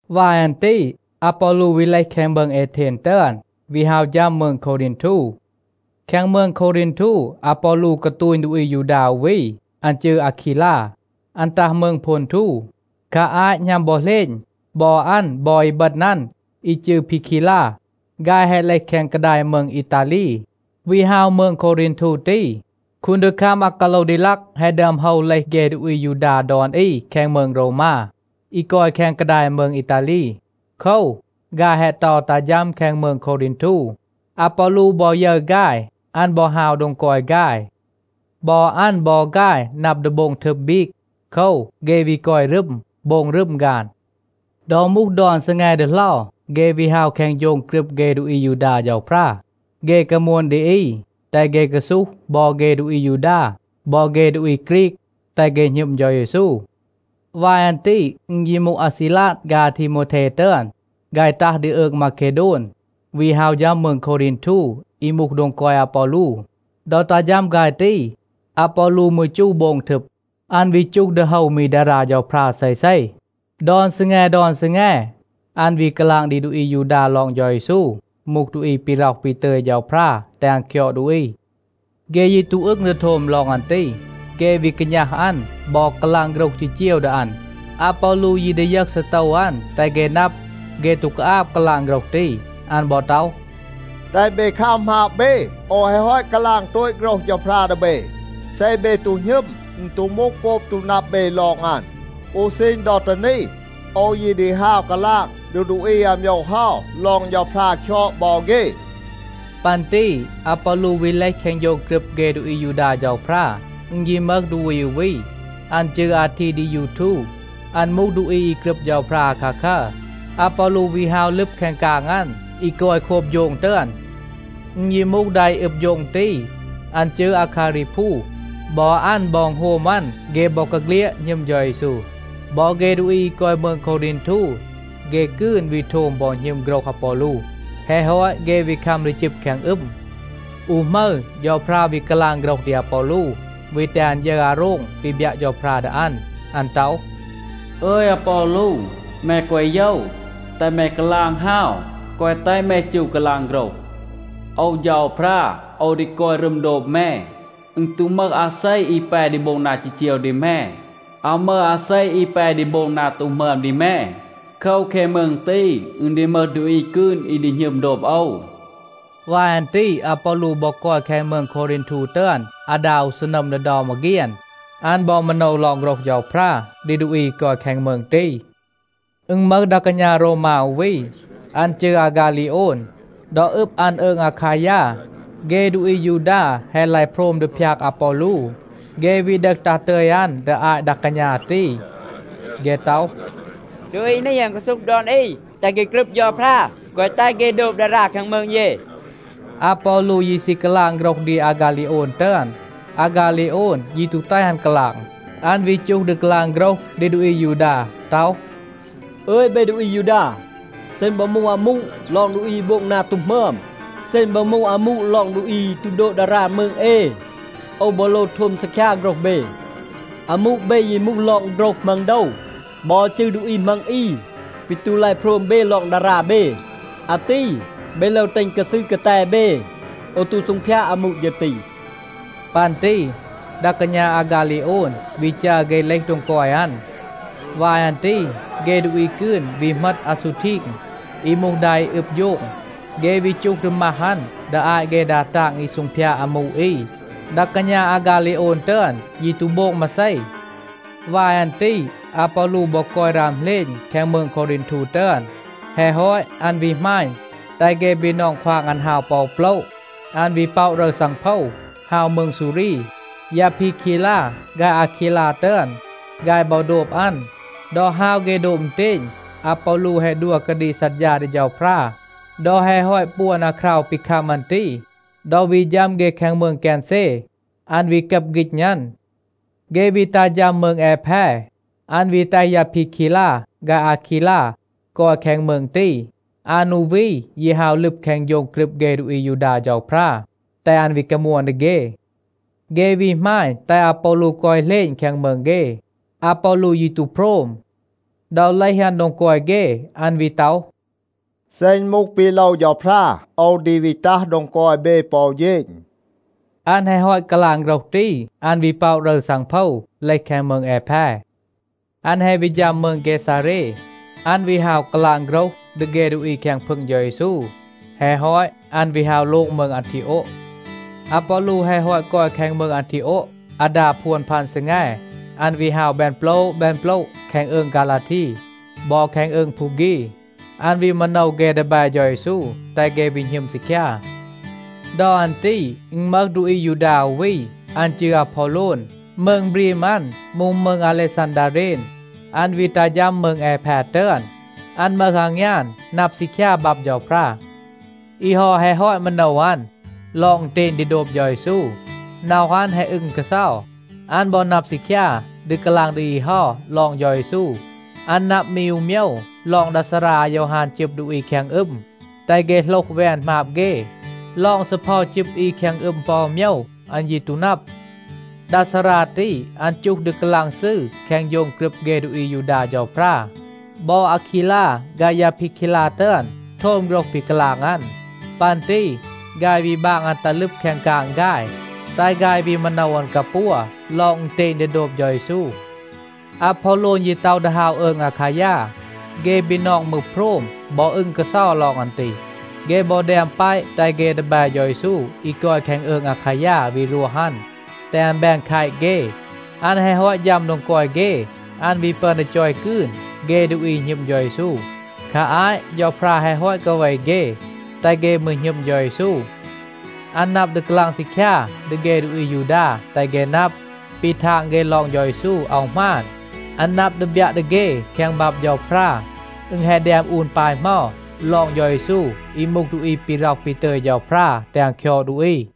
วาย อัน ตี อาปอลู วี เลห แคง มืง เอเทน ตึอน, วี ฮาว ฌัม มืง โควรีนทู. แคง มืง โควรีนทู อาปอลู กาตูณ ดูอี อายูดา อู วี, อัน จืร อาคีลา. อัน ตัห มืง โพนทู. คา อาต หณัม บอ เหลณ, บอ อัน บอ อีบึณ อัน, อี จืร พีคีลา, ฆาย แฮะ เลห แคง กาดาย มืง อีตาลี, วี ฮาว มืง โควรีนทู ตี. คูนดีคัม อากาโลวดีลัก แฮะ ดึอม โฮว เลห เฆ ดูอี อายูดา ดอน อี แคง มืง โรวมา, อี กอย แคง กาดาย มืง อีตาลี. โคว, ฆาย แฮะ เตา ตัห ฌัม แคง มืง โควรีนทู. อาปอลู บอ ยึร ฆาย, อัน บอ ฮาว โดง กอย ฆาย. บอ อัน บอ ฆาย นับ ดี โบง ทึบ บีก. โคว, เฆ วี กอย รึม, โบง รึม ฆาน. ดอ มูห ดอน ซีแง ดีเหลา, เฆ วี ฮาว แคง โฌง กรึบ เฆ ดูอี อายูดา เฌาพรา. เฆ กามวน ดี อี, แตห เฆ กาซูห บอ เฆ ดูอี อายูดา บอ เฆ ดูอี ฆรีก, แตห เฆ หณึม เฌา เยซู. วาย อัน ตี อึณ ยี มูห อาซีลาด ฆาย อาทีโมวเท ตึอน, ฆาย ตัห ดี อืง มาเคโดน, วี ฮาว ฌัม มืง โควรีนทู อี มูห โดง กอย อาปอลู. ดอ ตัห ฌัม ฆาย ตี, อาปอลู มืร จู โบง ทึบ. อัน วี จูห ดี โฮว มี ดารา เฌาพรา เซเซ. ดอน ซีแง, ดอน ซีแง, อัน วี กาลาง ดี ดูอี อายูดา ลอง เฌา เยซู มูห ดูอี ปี ร็อห ปี ตึย เฌาพรา แตห อัน คยอด ดูอี. เฆ ยี ตู อึง ดี โทม ลอง อัน ตี, เฆ วี กาณัห อัน บอ กาลาง โฆรห จีจีว ดี อัน. อาปอลู ยี ดียึห ซีโตว อัน, แตห เฆ นับ, เฆ ตู กาอาบ กาลาง โฆรห ตี. อัน บอ ต็อห, “แตห เบ คัม หมาบ เบ. โอว แฮะ ฮอต กาลาง โตต โฆรห เฌาพรา ดี เบ. เซ เบ ตู หณึม, อึณ ตู มูห โกบ ตู นับ เบ ลอง อัน. อู ซีณ ดอ ตี นี, โอว ยี ดี ฮาว กาลาง ดี ดูอี อาโมยว เฮา ลอง เฌาพรา คยอด บอ เฆ.” ปัน ตี อาปอลู วี เลห แคง โฌง กรึบ เฆ ดูอี อายูดา เฌาพรา. อึณ ยี มึห ดูอี อู วี, อัน จืร อาทีดียูทู. อัน มูห ดูอี อี กรึบ เฌาพรา อาคาคัร. อาปอลู วี ฮาว ลึบ แคง กาง อัน, อี กอย โคบ โฌง ตึอน. อึณ ยี มูห ดา อี อึบ โฌง ตี, อัน จืร อาคารีพู. บอ อัน บอ อึณโฮม อัน, เฆ บอกาเฆลียด หณึม เฌา เยซู. บอ เฆ ดูอี อี กอย มืง โควรีนทู, เฆ กืน วี โทม บอ หณึม โฆรห อาปอลู. แฮะ ฮอต เฆ วี คัม ดี จึบ แคง อึม. อู หมึร, เฌาพรา วี กาลาง โฆรห ดี อาปอลู, วี แตห อัน ยึร อาโรง ปี บยัะ เฌาพรา ดี อัน. อัน ต็อห, “อึย อาปอลู. แม แกวะ โยว. แตห แม กาลาง ฮาว, แกวะ แตห แม จู กาลาง โฆรห. โอว เฌาพรา, โอว ดี กอย รึม โดบ แม. อึณ ตู มึห อาเซ, อี แป ดี โบง นา จีจีว ดี แม. อาว มึห อาเซ อี แป ดี โบง นา ตู หมึอม ดี แม. โคว, แคง มืง ตี, อึณ ดี มึห ดูอี กืน อี ดี หณึม โดบ โอว.” วาย อัน ตี อาปอลู บอ กอย แคง มืง โควรีนทู ตึอน อาดา อู ซีนัม ดี เดา มาเฆียน. อัน บอ มาโนว ลอง โฆรห เฌาพรา ดี ดูอี อี กอย แคง มืง ตี. อึณ มึห ดา กาณา โรวมา อู วี. อัน จืร อาฆาลีโอน. ดอ อึบ อัน อืง อาคายา, เฆ ดูอี อายูดา แฮะ ลาย โพรม ดี พยาก อาปอลู. เฆ วี ดึห ตัห ตึย อัน ดี อาต ดา กาณา ตี. เฆ ต็อห, “ดูอี นี, อัน กาซูห ดอน อี, แตห เฆ กรึบ เฌาพรา, แกวะ แตห เฆ โดบ ดารา แคง มืง เย.” อาปอลู ยี ซี กาลาง โฆรห ดี อาฆาลีโอน ตึอน. อาฆาลีโอน ยี ตู แตห อัน กาลาง. อัน วี จูห ดี กาลาง โฆรห ดี ดูอี อายูดา ต็อห, “อึย เบ ดูอี อายูดา, เซ อึณ บอ มูห อามู ลอง ดูอี อี โบง นา ตู หมึอม, เซ อึณ บอ มูห อามู ลอง ดูอี อี ตู โดบ ดารา มืง เอ, โอว บอ โลว โทม ซีคยา โฆรห เบ. อามู เบ ยี มูห ลอง โฆรห มัง โดว บอ จืร ดูอี มัง อี ปี ตู ลาย โพรม เบ ลอง ดารา เบ. อาตี เบ โลว แตห อึณ กาซืร กาแต เบ. โอว ตู ซูงพยาด อามู ฌึร ตี.” ปัน ตี ดา กาณา อาฆาลีโอน วี จัร เฆ เลห โดง กอย อัน. วาย อัน ตี เฆ ดูอี กืน วี เหมต อาซูทีง, อี มูห ดา อี อึบ โฌง. เฆ วี จูห ดี มัห อัน ดี อาต เฆ ดา ตาง อี ซูงพยาด อามู อี. ดา กาณา อาฆาลีโอน ตึอน ยี ตู โบง มาเซ. วาย อัน ตี อาปอลู บอ กอย ราม เหลณ แคง มืง โควรีนทู ตึอน. แฮะ ฮอต, อัน วี หมาณ, แตห เฆ บีนอง ควาง อัน ฮาว ปอ อู โปละ. อัน วี ป็อะ รึร ซังโพว ฮาว มืง ซูรี. ยา พีคีลา ฆาย อาคีลา ตึอน, ฆาย บอ โดบ อัน. ดอ ฮาว เฆ โดบ อึณเตณ, อาปอลู แฮะ ดัว กาดีก ซัดฌา ดี เฌาพรา. ดอ แฮะ ฮอต ปวน อาคราว ปี คัม อัน ตี, ดอ วี ฌัม เฆ แคง มืง เกนเซ, อัน วี กับ ฆีณ อัน. เฆ วี ตัห ฌัม มืง แอแพ, อัน วี แตห ยา พีคีลา ฆาย อาคีลา กอย แคง มืง ตี. อัน อู วี ยี ฮาว ลึบ แคง โฌง กรึบ เฆ ดูอี อายูดา เฌาพรา, แตห อัน วี กามวน ดี เฆ. เฆ วี หมาณ, แตห อาปอลู กอย เหลณ แคง มืง เฆ. อาปอลู ยี ตู โพรม. ดอ เลห อัน โดง กอย เฆ, อัน วี ต็อห, “เซ อึณ มูห ปี โลว เฌาพรา, โอว ดี วี ตัห โดง กอย เบ ปอ อู เฌณ.” อัน แฮะ ฮอต กาลาง โฆรห ตี, อัน วี ป็อะ รึร ซังโพว, เลห แคง มืง แอแพ. อัน แฮะ วี ฌัม มืง เกซาเร, อัน วี ฮาว กาลาง โฆรห ดี เฆ ดูอี แคง พึง เฌา เยซู. แฮะ ฮอต, อัน วี ฮาว โลง มืง อันทีโอะ. อาปอลู แฮะ ฮอต กอย แคง มืง อันทีโอะ อาดา พวน พัน ซีแง, อัน วี ฮาว แบน โปละ แบน โปละ แคง อืง ฆาลาที บอ แคง อืง พูฆี. อัน วี มาโนว เฆ ดีแบ เฌา เยซู แตห เฆ วี หณึม ซีคยา. ดอ อัน ตี อึณ มึห ดูอี อายูดา อู วี, อัน จืร อาพอโลน. มืง บรีม อัน มูห มืง อาเลซันดาเรน. อัน วี ตัห ฌัม มืง แอแพ ตึอน. อัน มึห อางยาน, นับ ซีคยา บับ เฌาพรา. อี เฮา แฮะ ฮอต มาโนว อัน ลอง อึณเตณ ดี โดบ เฌา เยซู. น็อห อัน แฮะ อึง กาเซา. อัน บอ นับ ซีคยา ดี กาลาง ดี อี เฮา ลอง เฌา เยซู. อัน นับ มี อู โมยว ลอง ดา ซารา อายอฮาน จึบ ดูอี แคง อึม, แตห เฆ โหลห แวน หมาบ เฆ. ลอง ซีเพา จึบ อี แคง อึม ปอ อู โมยว อัน ยี ตู นับ. ดา ซารา ตี, อัน จูห ดี กาลาง ซืร แคง โฌง กรึบ เฆ ดูอี อายูดา เฌาพรา. บอ อาคีลา ฆาย ยา พีคีลา ตึอน โทม โฆรห ปี กาลาง อัน. ปัน ตี ฆาย วี บาง อัน ตัห ลึบ แคง กาง ฆาย, แตห ฆาย วี มาโนว อัน กาปัว ลอง อึณเตณ ดี โดบ เฌา เยซู. อาพอโลน ยี ต็อห ดี ฮาว อืง อาคายา. เฆ บีนอง มืร โพรม บอ อึง กาเซา ลอง อัน ตี. เฆ บอ แดม แปะ แตห เฆ ดีแบ เฌา เยซู อี กอย แคง อืง อาคายา วี รวห อัน, แตห อัน แบน แคต เฆ. อัน แฮะ ฮอต ฌัม โดง กอย เฆ, อัน วี ปึอน ดี จอย กืน เฆ ดูอี อี หณึม เฌา เยซู. คา อาต เฌาพรา แฮะ ฮอต กาเว เฆ, แตห เฆ มืร หณึม เฌา เยซู. อัน นับ ดี กาลาง ซีคยา ดี เฆ ดูอี อายูดา, แตห เฆ นับ, ปี ทาง เฆ ลอง เฌา เยซู อาว หมาน. อัน นับ ดี บยัะ ดี เฆ แคง บับ เฌาพรา, อึณ แฮะ แดม อูน ปาย เหมา ลอง เฌา เยซู อี มูห ดูอี ปี ร็อห ปี ตึย เฌาพรา แตห อัน คยอด ดูอี.